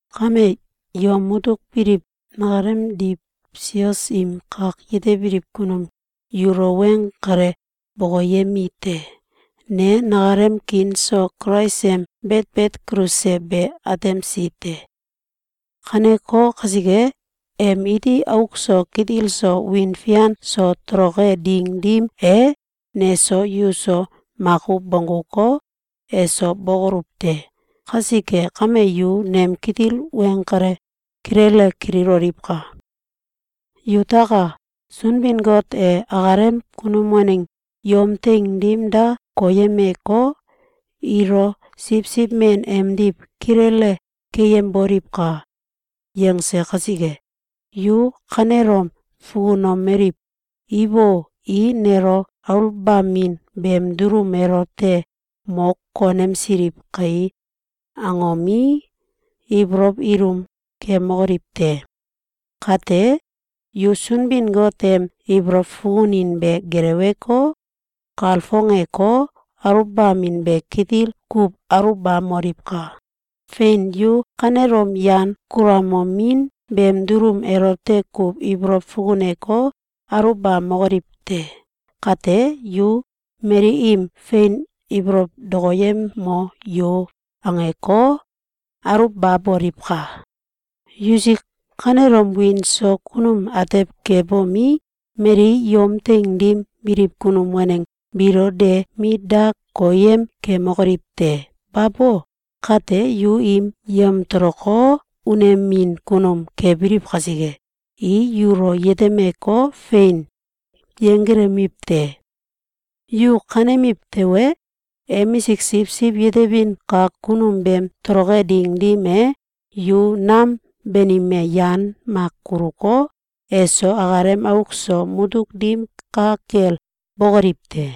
Kame, yom mutuk biliw nakalemdiw sios im kak yetebiliw kunum yulo weng kale bokoyemi te. Ne nakalem kiin so Kulais em betbet kulse be atemsi te. Kaneko kasike, em iti auk so kitil so, wiin fian so toloke ding dim e, neso yuso makuw bongguko, eso bokoluw te. Kasike kame, yu nem kitil weng kale kilele kililoliwka! Yutaka! Sunbin-Got e akalem kunum waneng yom teing dim da koyemeko, “Ilo siwsiw men emdiw kilele keyemboliwka!”, yangse kasike, yu kanelom fukunomeliw “Ibo! I nelo aluwbamin beem dulum elote mo konemsiliw kai!”, angomi, ibolow ilum kemokoliw te! Kate, yu Sunbin-Got em ibolow fukunin be geleweko, kalfongeko, aluwbamin be kitil kuw aluwbamoliwka! Fein! Yu kanelom yan kulamomin beem dulum elote kuw ibolow fukuneko, aluwbamokoliw te! Kate, yu “Mali im fein ibolow dokoyemo yo!”, angeko, aluwbaboliwka! Yusik kanelom wiin so kunum atew kebomi, mali yom teing dim biliw kunum waneng biilo de mit da koyem kemokoliw te! Babo! Kate, yu im yamtoloko, unemin kunum kebiliw kasike, i yulo yetemeko, fein yenggelemiw te! Yu kanemiw tewe, emisik siwsiw yetebin kak kunum beem toloke ding dim e, yu nam banime yan mak kuluko, eso akalem auk so mutuk dim ka kel bokoliw te.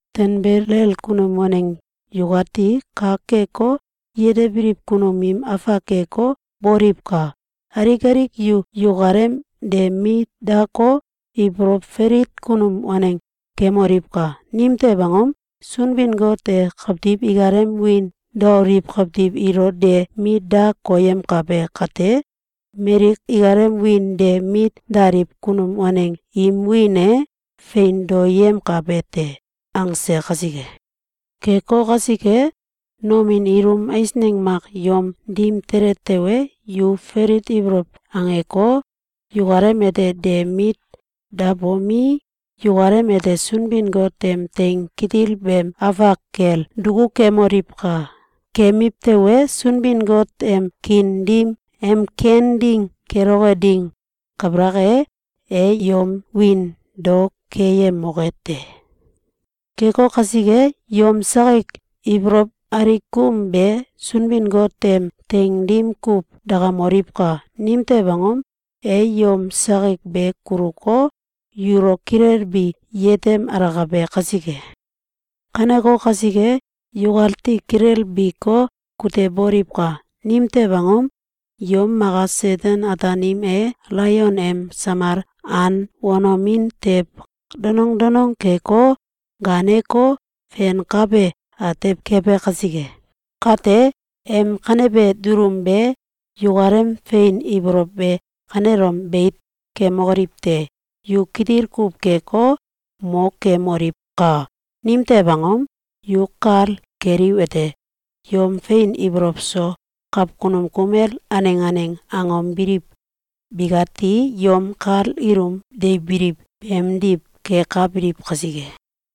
Tanbelel kunum waneng yukati kak keko, yetebiliw kunum im afak keko, boliwka! Alik alik yu yukalem de mit dako, ibolow falit kunum waneng kemoliwka! Nimtew angom? “Sunbin-Got e kawtiw ikalem wiin doaliw kawtiw ilo de mit da koyemkabe kate, mali ikalem wiin de mit daliw kunum waneng im wiin e fein daoyemkabe te.”, angse kasike. Keko kasike, nomin ilum eisneng mak yom dim tele tewe, yu falit ibolow angeko, yukalem ete de mit dabomi, yukalem ete Sunbin-Got em teing kitil beem afak kel duku kemoliwka! Kemiw tewe, Sunbin-Got em kiin dim em ken ding keloke ding kabalak e, e yom wiin dao keyemoke te. Keko kasike, yom sakik ibolow alikum be Sunbin-Got em teing dim kuw dakamoliwka! Nimtew angom? E yom sakik be kuluko, yulo kilelbi yetem alakabe kasike. Kaneko kasike, yukati kilelbiko, kuteboliwka! Nimtew angom? Yom maka Seten-Ataanim e alaion em samal an wanomin tew donong donong keko, gaaneko, fenkabe atew kebe kasike. Kate, em kanebe dulum be yukalem fein ibolow be kanelom beit kemokoliw te! Yu kitil kuw keko, mo kemoliwka! Nimtew angom? Yu kal keliwete: Yom fein ibolow so kawkunum kumel aneng aneng angom biliw bikati yom kal ilum deibiliw beemdiw kekabiliw kasike.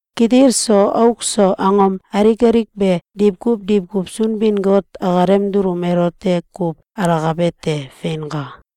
Kitil so auk so, angom alik alik be diwkuw diwkuw Sunbin-Got akalem dulum elote kuw alakabe te. Feinka!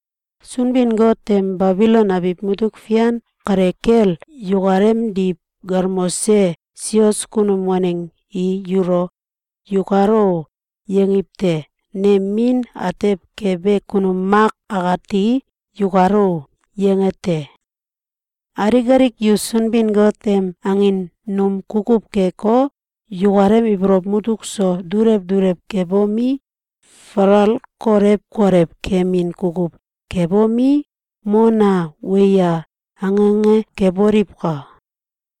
Sunbin-Got em Babilon abiw mutuk fian kale kel yukalemdiw galmose sios kunum waneng i yulo “Yukalo!”, yangiw te. Nem min atew kebe kunum Mak akati “Yukalo!”, yange te. Alik alik yu Sunbin-Got em angin num kukuw keko, yukalem ibolow mutuk so dulew dulew kebomi, falal kolew kolew kemin kukuw kebomi, “Mona! Weya!”, ange ange keboliwka!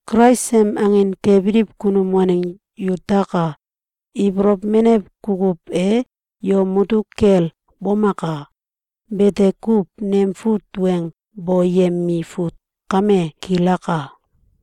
Kulais em angin kebiliw kunum waneng yutaka! Ibolow menew kukuw e yom mutuk kel bomaka! Bete kuw. Nem fut weng boyemi fut kame kilaka.